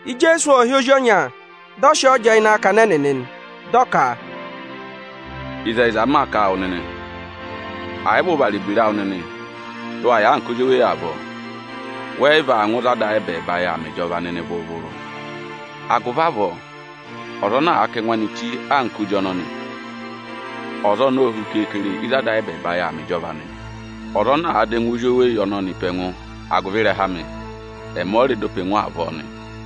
Ijeesu ộ hị́ ozi ọnya, dị ọ sị ọọ jẹẹ ịnị akakana ẹnịnị nị, dị ọ ka, “Ịzẹyịza m maa kà a wụ nịnị, ẹ̀ yị vị ụ vara ebira awụ nịnị dị ụ wa yà anka ozweyi avọọ, wẹ yị vaa ngụ ịzị Ada ayị ẹbẹẹba yà aa mẹ ịjọva nịnị vụrụ-vụrụ. Agụvị avọọ, ọza ana àa kà ẹngụ anị chí anka ozi ọnọnị, ọza ọnọọ o hu keekere ịzị Ada ayị ẹbẹẹba yà aa mẹ ịjọva nị. Ọza ana àa dọ ẹngụ ozweyi ọnọnị pe ẹngụ agụvị ịrẹha amị, ẹmị ọ rẹ dọ pe ẹngụ avọọ nị.”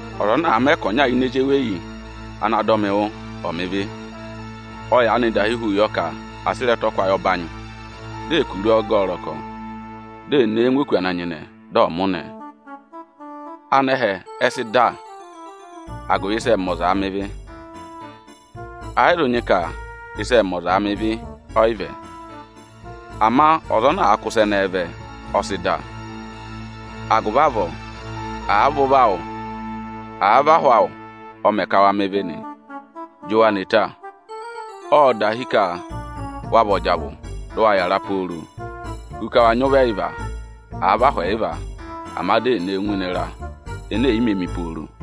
“Ọza ana àa mẹ ka ọnya ini ezi eweyi ana dọ mị wụ́ aanị, ka ọ̀ mẹ ịvị, ọ yaanị dahi hu yọ ka à sị ịrẹtọkwayị ọbanyị, di è kuru ọ gẹ ẹ ọrọkọ, di è ne e ngụ òkū ana nyịnẹ, dị ọ mụnẹ ẹ. Anẹhẹ ẹ sị dà agụvị ịsị ẹẹ̄ mẹ ọzaa mẹ ịvị. Ẹ yị zụ nyị ka ịsị ẹẹ̄ mẹ ọzaa mẹ ịvị, ọyị vẹ; ama ọza ana àa kụ́ ịsa ẹnẹẹ vẹ, ọ sị dà. Agụvị avọọ, àa vị ụvọ awụ, à vị ahụ awụ ọ mẹ ka wa mẹ ịvị nị, jị wa ne ta! Ộ dahi ka wa vị ọjavụ dị ụ wa yàra pooro, hu ka wa nyị ụvọ ẹyịva, àa vị ahụ ẹyịva, ama di è ne wu ngụ ịnị ịra ene è yi mē mi pooro.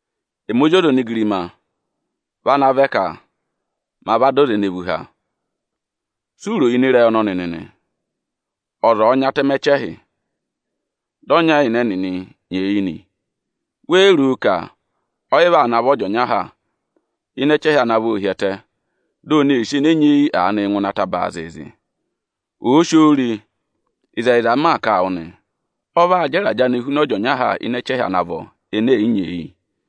(Ẹmị Ozi ọza onigirima vị ana vẹ ka ma va dọ aza ene vú há.) Si u ro ịnị ịrẹyị ọnọnị nịnị? Ọza ọ̀ọ nyị atẹmẹ ẹchẹhị, dị ọnya ịnị ẹnịnị nyeeyi nị, wéé ro ka ọyị vaa navọ ọ jị ọnya ha ịnị ẹchẹhị ana vọ hi ẹtẹ, di ò nee sì ene nyeeyi aanịị ngụ ịnị ataba zịịzị? Òo si oo re, ịzẹyịza m maa kà a wụ nị, ọ vaa jẹ ịrajẹ anịị huna ọ jị ọnya ha ịnị ẹchẹhị ana vọ ene è yi nyeeyi.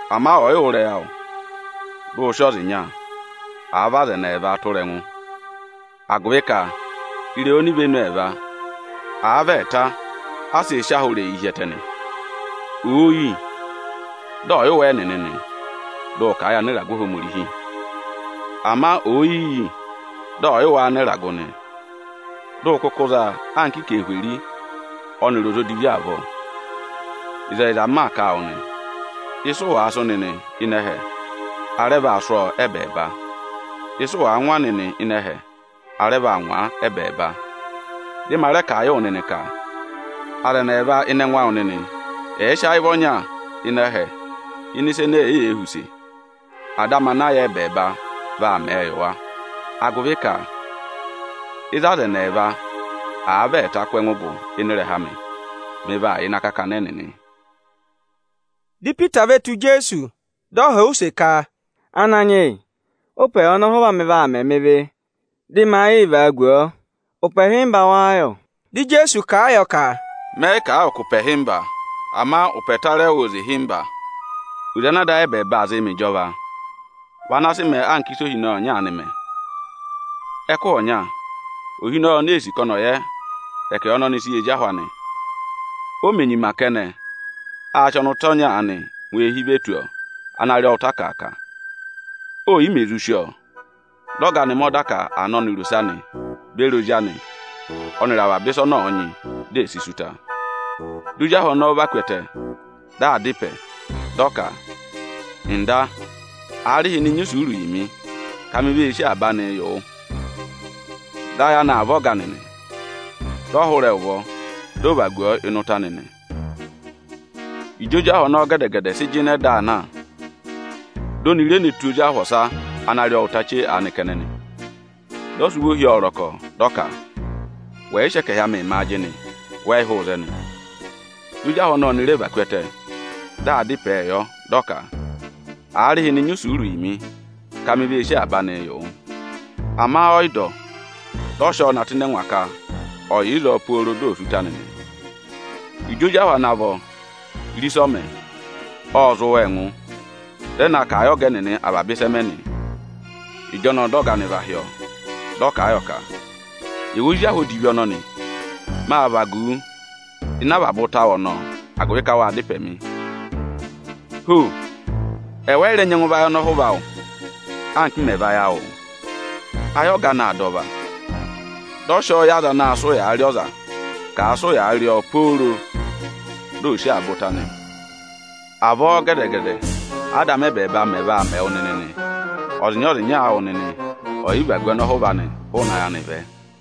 Ama ọ̀ yị wụ́ ịrẹyị awụ, dị ụ sị ọza ịnya, àa vị aza ẹnị ẹẹva tụra ẹngụ; agụvị ka ịrẹyị onivenu ẹẹva, à vị ẹẹta a sịị̄ sị ahụ ịrẹyịị hi ẹtẹ nị. Òo yi, dị ọ̀ yị wụ́ ẹ́ẹnịnị nị, dị ụ kà a yị anịragụ Ohomorihi. Ama òo yi yi, dị ọ̀ yị wụ́ áanịragụ nị, dị ụ kụkụ za a anka anarịmadọwụ ọnịrị ọza odivi avọọ. Ịzẹyịza m maa kà a wụ nị, ịsị ụ wàa sụ́ nịnị ịnị ẹhẹ, a rẹ vaa sụ́ ọọ ẹ́bẹẹba. Ịsị ụ wàa ngwa nịnị ịnị ẹhẹ, a rẹ vaa ngwa a ẹ́bẹẹba. Dị ma rẹ kà a yị wụ nịnị ka: Aza ẹnị ẹẹva ịnị ẹngụ awụ nịnị ẹ̀ẹ sị ayị vị ọnya ịnị ẹhẹ ịnị ịsa ene èeyee họ̀ use, Ada amị ana yà ẹbẹẹba vị ana aa mẹ̀ ẹ yị wa. Agụvị ka ịzị aza ẹnị ẹẹva, àa vị ẹẹta kụ́ ẹngụ gụ ịnị ịrẹha amị, mị vaa yà ịnị akakana ẹnịnị.” Dị Ipita ve tù Ijeesu, dị ọ họ̀ ọ use ka, “Ananyị yị, ụ́pẹ yà ọnọhụva amị vaa mẹ mị ịrẹyị, dị ma yịị vagu ọọ? Ụpẹ ịhịmba wáá yọ?” Dị Ijeesu kà a yọ ka, “Mẹ yị kà a wụ ka ụpẹ ịhịmba, ama ụpẹ ẹtarẹwụ oze ịhịmba. Oze ana Ada ayị ẹbẹẹba aa zịị mẹ ịjọva vị ana sị mẹẹ anka ịsị ohinọyị ọnya aanị mẹ. Ẹkụhị ọnya ohinọyị ọnọọ ee sì ka ọnị ọ̀ yẹ ẹkẹhị ọnị ọnị sị yị ezi ahụ anị. O mè nyima kẹnẹ, â sị ọnụta ọnya anị ngụ eehi ve tù ọọ ana rị ọọ ụta akàaka. Ò yi mè zụ sí ọọ, dị ọga anị mẹ ọda ka à ná ọnịrị ose anị beri ozi anị ọnịrị avaba ịsa ọnị ọ̀ọ nyị, di è si sí ụta nị. Dị ozi ahụ ọnọọ va ku ẹtẹ, dị aa dá ịpẹ, dị ọ ka: ‘Ọga, aarịhịnị nyị isuuru yị mị, ka mi vee sí avaba anịị yị wụ.’ Dị ayị anị aa vá ọga anị, dị ọ hụrẹ ẹ ụvọ, dị ọ vagu ọọ ịnị ụta anị nị. Ịjị ozi ahụ ọnọọ gẹdẹ-gẹdẹ sị jịnẹ dị aa na, di oni re ne tù ozi ahụ ọsa ana rị ọọ ụta chee aanị kẹnẹ nị. Dị ọ sị ụvọ hi ọọ ọrọkọ, dị ọ ka: ‘Wẹ̀ yị sị ẹkẹhị amịị mị ajịnị, wẹ yị hụụ ịzẹnị.’ Dị ozi ahụ ọnọọ ọnị rẹ và ku ẹtẹ, dị aa dá ịpẹẹ yọ, dị ọ ka: ‘Aarịhịnị nyị isuuru yị mị, ka mi vee sí avaba anịị yị wụ.’ Ama ọ yị dọ. Dị ọ sị ọọ na tụ́ ịnị ẹngwa ka ọ̀ yà ịzọọ pooro di ò sí ụta anị nị. Ịjị ozi ahụ ana vọ re ịsị ọ mẹ, ộ zị wa ẹngụ, dị ẹ na kà a yị ọga ẹnịnị avaba ịsị ẹ mẹ nị. Ịjọnọọ dị ọga anị va hị́ ọọ, dị ọ kà a yọ ka: ‘Ẹwụ ozi ahụ odivi ọnọnị, mâ vagu wu ịnị avaba ụta awụ ọnị ụ rị mị agụvị ka wâ dá ịpẹ mị. Ho! Ẹwụ ẹ yị rẹ nyẹngụ vayị ọnọhụva awụ, anka m mẹ̀ vayị awụụ?’ Ayị ọga anị aa dà ọva, dị ọ sị ọọ yị aza anaā sịị ụyaa rị ọza ka àa sị ụyaa rị ọọ pooro di ò sí avaba ụta anị. Avọọ gẹdẹ-gẹdẹ Ada amị ẹbẹẹba mẹ̀ vaa mẹ wụ nịnị nị, ọzịnya-ọzịnya awụ nịnị ọ̀ yị vagu ọnọhụva anị hụụnị ayị anị vẹ.”